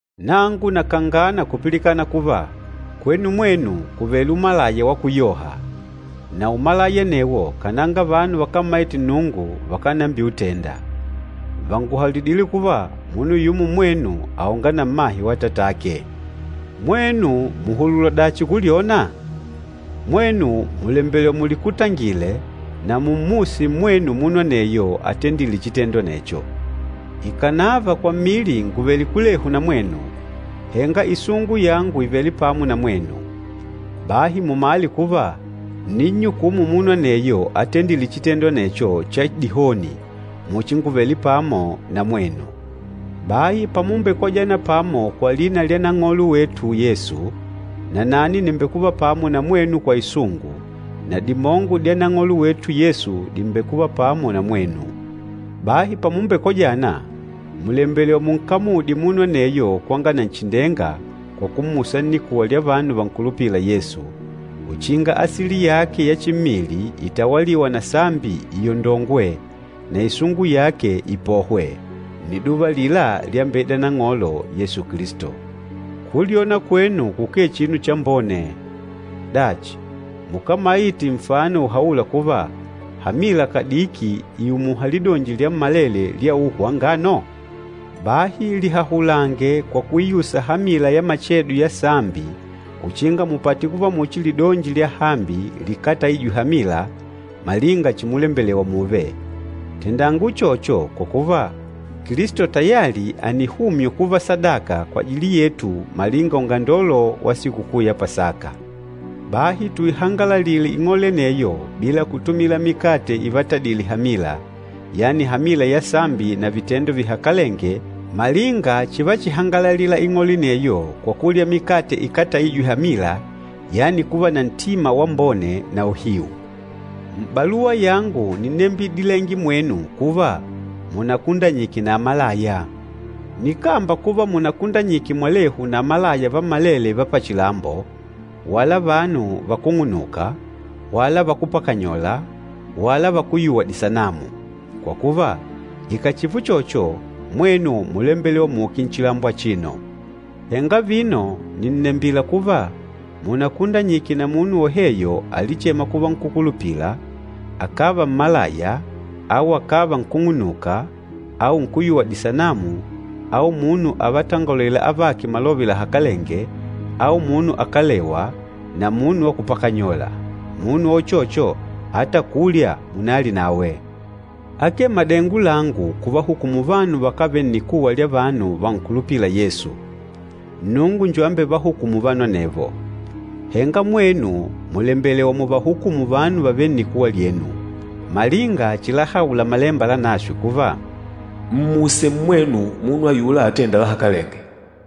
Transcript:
Nangu nakangana kupilikana kuva, kwenu mwenu kùvele umalaya wa kuyoha, na umalaya anewo kananga vanu vakámmaite Nnungu vakánambiutenda. Vànguhaulidile kuva, munu yumo mmwenu àonga na mmahe wa atatake! Mwenu mùhulula dachi kulyona? Mwenu mùlembelewa mulikutangile, na mummuse mmwenu munu aneyo atendîle chitendo anecho. Ikànava kwa mmili ngùvele kulehu na mwenu, henga isungu yangu ìvele pamo na mwenu. Bahi mumale kuva, ǹninnyukumu munu aneyo atendîle chitendo anecho cha dihoni muchi ngùvele pamo na mwenu. Bahi pamumbekojana pamo kwa lina lya Nang'olo wetu Yesu, nanani nìmbekuva pamo na mwenu kwa isungu, na dimongo dya Nang'olo wetu Yesu dìmbekuva pamo na mwenu. Bahi pamumbekojana, mùlembelewa munkamudye munu aneyo kwanga Nanchindenga kwa kummusa nnikuwa lya vanu vankulupîla Yesu, uchinga asili yake ya chimmili itawalîwa na sambi iondongwe, na isungu yake ipohwe, nniduva alila lyambeida Nang'olo Yesu Kilisto. Kulyona kwenu kukee chinu chambone! Dachi, mukámaite nfano uhaûla kuva, hamila kadiki ìumuha lidonji lyammalele lya uhu wa ngano? Bahi lihahulange kwa kuiusa hamila ya machedo ya sambi uchinga mupate kuva muchi lidonji lyahambi likátaijwe hamila, malinga chimulembelewa mùùve. Tendanga uchocho kwa kuva, Kilisto tayali ànihumywa kuva sadaka kwajili yetu malinga ungandolo wa Sikukuu ya Pasaka. Bahi tuihangalalile ing'ole aneyo bila kutumila mikate ivatadile hamila, yani hamila ya sambi na vitendo vihakalenge malinga chivachihangalalila ing'ole aneyo kwa kulya mikate ikátaijwe hamila, yani kuva na ntima wambone na uhiu. M'baluwa yangu nínnembidilenge mwenu kuva, munakundanyike na amalaya. Nikámba kuva munakundanyike mwalehu na amalaya vammalele va pachilambo, wala vanu vakúng'unuka, wala vakúpakanyola, wala vakúyuwa disanamu. Kwa kuva, ikàchiva uchocho, mwenu múlembelewa muuke nchilambo achino! Henga vino nìnnembila kuva, munakundanyike na munu woheyo alichêma kuva nkúkulupila, akàva mmalaya au akàva nkúng'unuka au nkúyuwa disanamu au munu avatongolêla avake malove lahakalenge au munu akalewa, na munu wa kupakanyola. Munu wa uchocho, ata kulya munalye nawe. Akee madengo langu kuvahukumu vanu vakávele nnikuwa lya vanu vankulupîla Yesu. Nnungu njo ambevahukûmu vanu anevo. Henga mwenu mùlembelewa muvahukumu vanu vavêle nnikuwa lyenu. Malinga chilahaula Malemba Lanaswe kuva, “Mmuse mmwenu munu ayula atênda lahakalenge.”